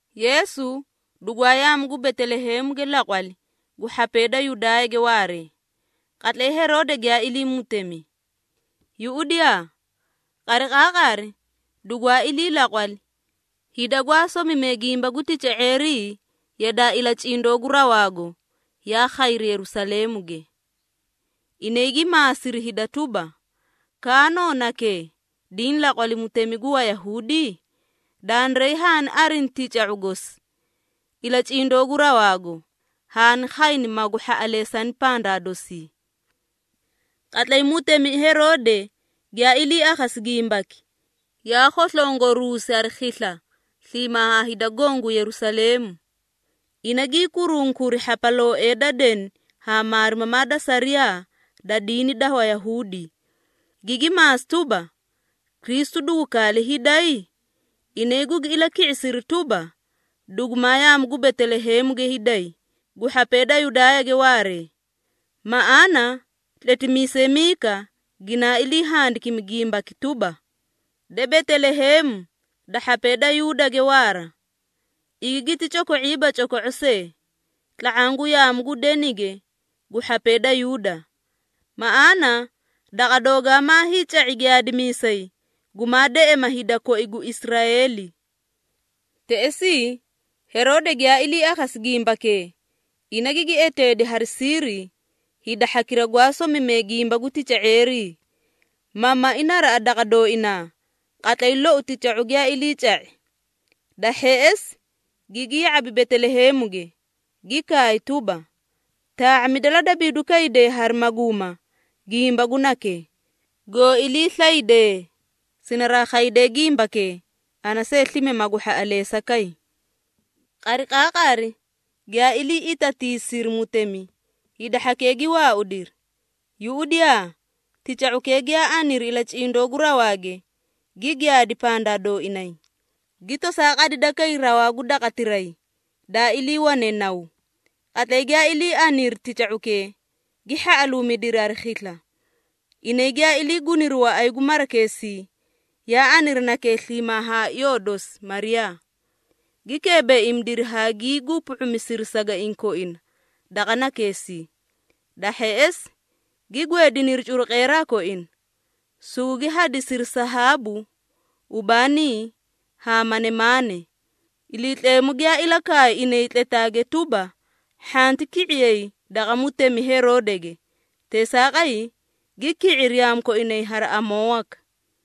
Yeesu dugwaa yaamu gu Beteleheemuge laqwali gu hhapee da Yudaayage waaree, qatlay Heroode giyaa ilii mutemi. Yuꞌudiyaa! Qariqaaqari dugwaa ilii laqwali, hida gwaa somimee gimba gu tica⁄eerii yadaa ilacindoo gu rawaago, yaa khayri Yerusaleemuge. Inay gi maasiri hida tuba, “Kaano nakee, diĩ laqwali mutemi gu Wayahuudi? Dandiray haani arini tica⁄u gosi, ilacindoo gu rawaago, haani khayni magu hhaꞌaleesani pandaa dosii.” Qatlay mutemi Heroode giyaa ilii akhasi gimbaki, yaa khoslongoruusi hari khisla sliimaa haa hida goõ gu Yerusaleemu. Ina gii kurunkuri hhapalooee da deni haa maarimamaa da sariyaa da diini da Wayahuudi, gigi maasi tuba, “Kristu dugu kaale hiiday?” Inay gugi ilaki⁄isiri tuba, “Dugumaa yaamu gu Beteleheemuge hiiday gu hhapee da Yudaayage waaree. Maꞌaana tletimiisay Miika ginaa ilii handikimi gimbaki tuba, ‘De Beteleheemu da hhapee da Yuudage waara, igi giti coko⁄iiba coko⁄o see tla⁄aã gu yaamu gu denige gu hhapee da Yuuda. Maꞌaana daqa doogaa maa hiica⁄i giyaadimiisay, gumaa deꞌema hida koi gu Israeeli.’” Teꞌesii, Heroode giyaa ilii akhasi gimbakee, ina gigi eteedi hari siiri hida hhakira gwaa somimee gimba gu tica⁄eerii, ma mai naraꞌa daqa dooinaa, qatlay loi tica⁄u giyaa iliica⁄i. Da hheꞌesi, gigi ya⁄abi Beteleheemuge, gi kaay tuba, “Taa⁄amida la dabiiduu kayday hari maguuma gimba gu nakee. Goo iliislaydee, sinaraa khaydee gimbakee, ana see slime magu hhaꞌaleesa kay.” Qariqaaqari giyaa ilii itatiisiri mutemi, hida hhakee gi waaudiri. Yuꞌudiyaa, tica⁄ukee giyaa aniri ilacindoo gu rawaage gi giyaadi pandaa dooinay, gi tosaa qadida kay rawaa gu daqatiray, daa iliiwane naw. Qatlay giyaa ilii aniri tica⁄ukee, gi hhaꞌaluumidiri hari khisla. Inay giyaa ilii guniri waꞌay gu marakeesii, yaa aniri nakee sliimaa haa iyoo dosi Mariyaa, gi keebeeimidiri haa gii gupu⁄umisiri sagaiĩ koina daqa nakeesii. Da hheꞌesi, gi gweediniri curuqeeraa koina, sugugi hadisiri sahaabu, ubaanii haa manemaane. Iliitleemu giyaa ilakaay inay tletaage tuba, hhanti ki⁄iyay daqa mutemi Heroodege. Teesaaqay, gi ki⁄iri yaamu koinay hari amoo waka.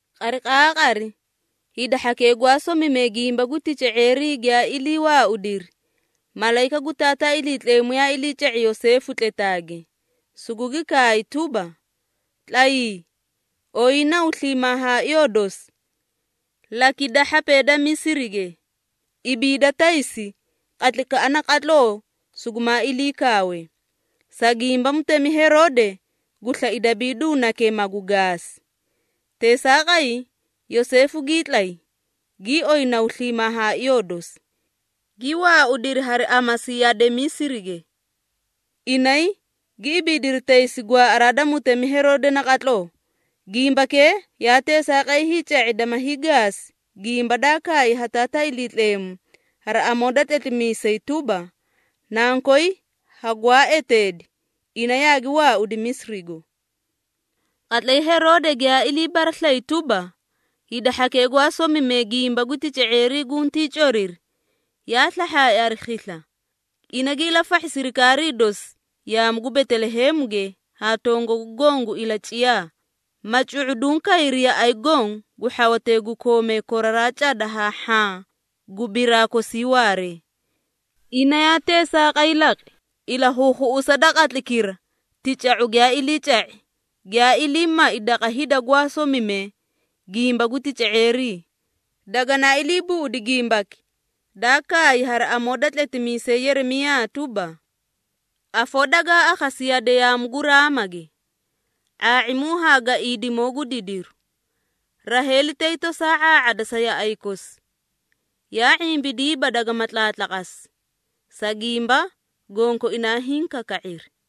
Qariqaaqari, hida hhakee gwaa somimee gimba gu tica⁄eerii giyaa ilii waaudiri, malayika gu Taataa Iliitleemu yaa iliica⁄i Yoseefu tletaage, sugugi kaay tuba, “Tlayii! Oyii naw sliimaa haa iyoo dosi, lakida hhapee da Misirige. Ibiida taysi qatlaykaꞌa naqatloo sugumaa ilii kaawe, sa gimba mutemi Heroode gu slai dabiidu nakee, magu gaasi.” Teesaaqay, Yoseefu gii tlay, gii oyi naw sliimaa haa iyoo dosi, gi waaudiri hari amasi yade Misirige. Inay gi ibiidiri taysi gwaaꞌaraa da mutemi Heroode naqatloo. Gimbakee yaa teesaaqay hiica⁄i dama hiigaasi gimba daa kaay haa Taataa Iliitleemu hari amoo da tletimiisay tuba, “Nankoy hagwaa eteedi, ina yaagi waaudi Misirigo.” Qatlay Heroode giyaa ilii baraslayi tuba, hida hhakee gwaa somimee gimba gu tica⁄eerii guntii coriri, yaa slahhaai hari khisla. Ina gi ilafahhi sirikaarii dosi yaamu gu Beteleheemuge haa tongagu goõ gu ilaciyaa, ma cu⁄uduũ kayri yaꞌay goõ gu hhawatee gu koomee koraraa cada haa hhaã gu biraa kosii waaree. Ina yaa teesaaqay laqi, ilakhuukhuꞌusa da qatlaykira tica⁄u giyaa iliica⁄i, giyaa ilii mai daqa hida gwaa somimee gimba gu tica⁄eerii. Daganaa ilii buꞌudi gimbaki, daa kaay hari amoo da tletimiisay Yeremiyaa tuba, “Afoo dagaa akhasi yade yaamu gu Raamage, ⁄aa⁄imu haa gaiidimoo gu didiru. Raheeli tay tosaa ⁄aa⁄ada sa yaꞌay kosi, yaa ⁄imbidiiba dagama tlaatlaqasi, sa gimba gonkoinaa hiĩ kaka⁄iri.”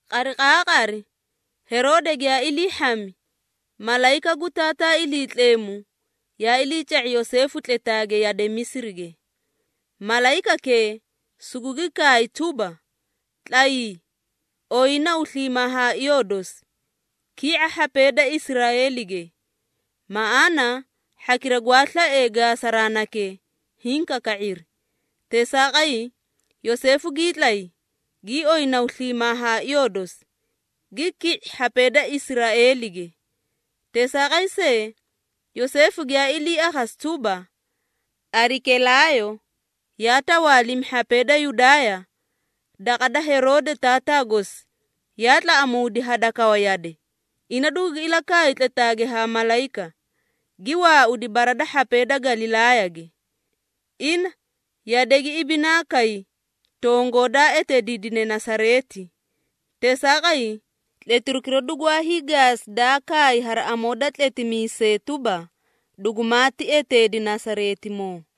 Qariqaaqari Heroode giyaa ilii hhami, malayika gu Taataa Iliitleemu yaa iliica⁄i Yoseefu tletaage yade Misirige. Malayikakee sugugi kaay tuba, “Tlayii! Oyii naw sliimaa haa iyoo dosi, ki⁄a hhapee da Israeelige, maꞌaana hhakira gwaa slaee gaasaraa nakee, hiĩ kaka⁄iri.” Teesaaqay, Yoseefu gii tlay, gii oyi naw sliimaa haa iyoo dosi, gi ki⁄i hhapee da Israeelige. Teesaaqay see, Yoseefu giyaa ilii akhasi tuba, Arikelaayo yaa tawaalimi hhapee da Yudaaya daqa da Heroode taataa gosi, yaa tlaꞌamuudi hadakawa yade. Ina dugugi ilakaay tletaage ha malayika, gi waaudi bara da hhapee da Galilaayage. Ina yade gi ibinaa kay tongoo daa eteediidine Nasareeti. Teesaaqay, tletirukira dugwaa hiigaasi daa kaay hari amoo da tletimiisee tuba, “Dugumaati eteedi Nasareetimoo.”